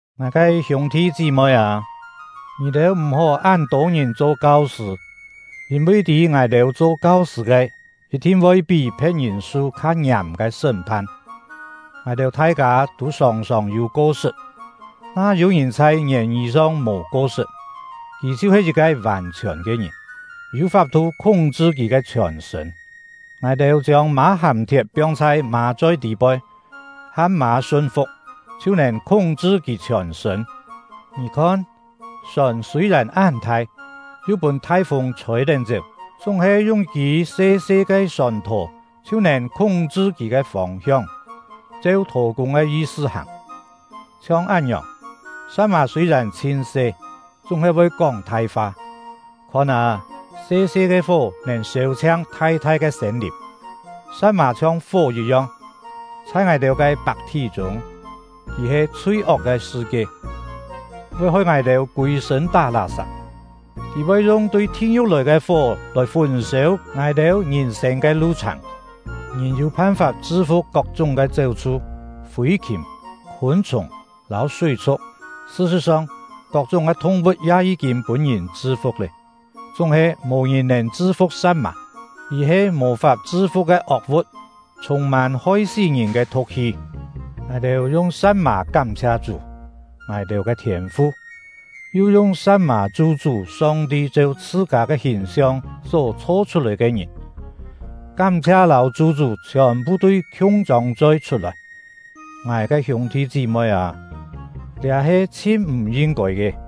Ngài ke hiûng-thi chí-moi â, ngì-têu m̀-hó án tô ngìn cho kau-sṳ̂, yîn-vi tî ngài-têu cho kau-sṳ̂ ke yit-thin voi pí phe̍t-ngìn su kha ngiàm ke sṳ́m-phan. Ngài-têu thai-kâ tû sòng-sòng yû ko-sṳt; na yû-ngìn chhai ngièn-ngî song mò ko-sṳt, kì chhiu-he yit-ke vàn-chhiòn ke ngìn, yû fap-thu khúng-chṳ kì ke chhiòn-sṳ̂n. Ngài-têu chiông mâ-hàm-thiet piong chhai mâ-choi tî-poi, ham mâ sun-fu̍k, chhiu nèn khúng-chṳ kì chhiòn-sṳ̂n. Ngì khon, sòn sûi-yèn án thai, yu pûn thai-fûng chhôi-tén chéu, chúng-he yung yit-kî se-se ke sòn-thò chhiu nèn khúng-chṳ kì ke fông-hiong, cheu thò-kûng ke yi-sṳ hàng. Chhiong án-ngiòng, sa̍t-mà sûi-yèn chhin se, chúng-he voi kóng thai fa. Khon â, se-se ke fó nèn sêu-chhiang thai-thai ke sêm-lìm! Sa̍t-mà chhiong fó yit-yong, chhai ngài-têu ke pak-thí-chûng, kì he chhui-ok ke sṳ-kie, voi hoi ngài-têu kûi-sṳ̂n tá lá-sap; kì voi yung tui thi-ngiu̍k lòi ke fó lòi fùn-sêu ngài-têu ngìn-sên ke lu-chhàng. Ngìn yû phan-fap chṳ-fu̍k kok-chúng ke chéu-chhu, fî-khìm, khûn-chhùng, lâu súi-chhu̍k; sṳ-sṳ̍t-song, kok-chúng ke thung-vu̍t ya yí-kîn pûn-ngìn chṳ-fu̍k lé. Chúng-he, mò ngìn nèn chṳ-fu̍k sa̍t-mà; kì he mò-fap chṳ-fu̍k ke ok-vu̍t, chhûng-mân hoi-sí ngìn ke thu̍k-hi. Ngài-têu yung sa̍t-mà kám-chhia Chú — ngài-têu ke Thiên-fu, yu yung sa̍t-mà chu-chú Song-ti cheu chhṳ-kâ ke hìn-siong só chho-chhut-lòi ke ngìn. Kám-chhia lâu chu-chú chhiòn-phu tui khiung chông choi chhut-lòi! Ngài ke hiûng-thi chí-moi â, liá he chhin m̀ yin-kôi ke!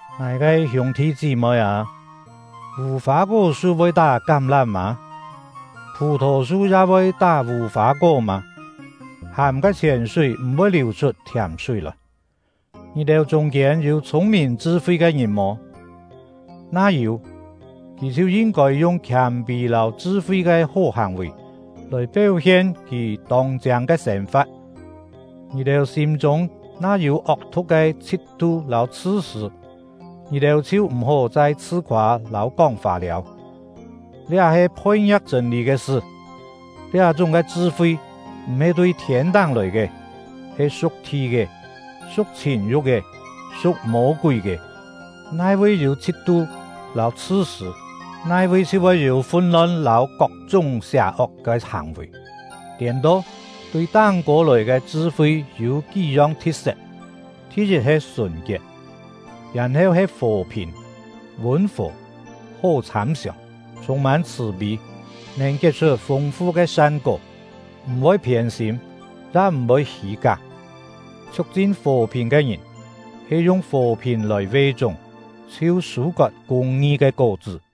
Ngài ke hiûng-thi chí-moi â, vù-fâ-kó-su voi tá kám-lám mâ? Phù-thò-su ya voi tá vù-fâ-kó mâ? Hàm ke chhièn-súi m̀-voi liù-chhut thiàm-súi lòi. Ngì-têu chûng-kiên yû chhûng-mìn chṳ-fi ke ngìn mò? Na yû, kì chhiu yin-kôi yung khiâm-pî lâu chṳ-fi ke hó hàng-vì, lòi péu-hien kì tông-chiâng ke sên-fa̍t. Ngì-têu sîm-chûng na yû ok-thu̍k ke chhit-tu lâu chhṳ-sṳ̂, ngì-têu chhiu m̀-hó chai chhṳ-khoâ lâu kóng fâ-liâu; liá he phoi-ngia̍k chṳ̂n-lî ke sṳ. Liá-chúng ke chṳ-fi m̀-he tui thiên-táng lòi ke, he su̍k thi ke, su̍k chhìn-yu̍k ke, su̍k Mô-kúi ke. Nai-vi yû chhit-tu lâu chhṳ-sṳ̂, nai-vi chhiu voi yû fun-lon lâu kok-chúng sià-ok ke hàng-vì. Tiên-to, tui táng-kô lòi ke chṳ-fi yû kí-yong thi̍t-set: Thi-yit he sùn-kiet, yèn-heu he fò-phìn, vûn-fò, hó chhâm-siòng, chhûng-mân chhṳ̀-pî, nèn kiet-chhut fûng-fu ke san-kó, m̀-voi phiên-sîm, ya m̀-voi hî-ká. Chhiuk-chin fò-phìn ke ngìn he yung fò-phìn lòi ve-chúng, chhiu sû-kot kûng-ngi ke kó-chṳ́.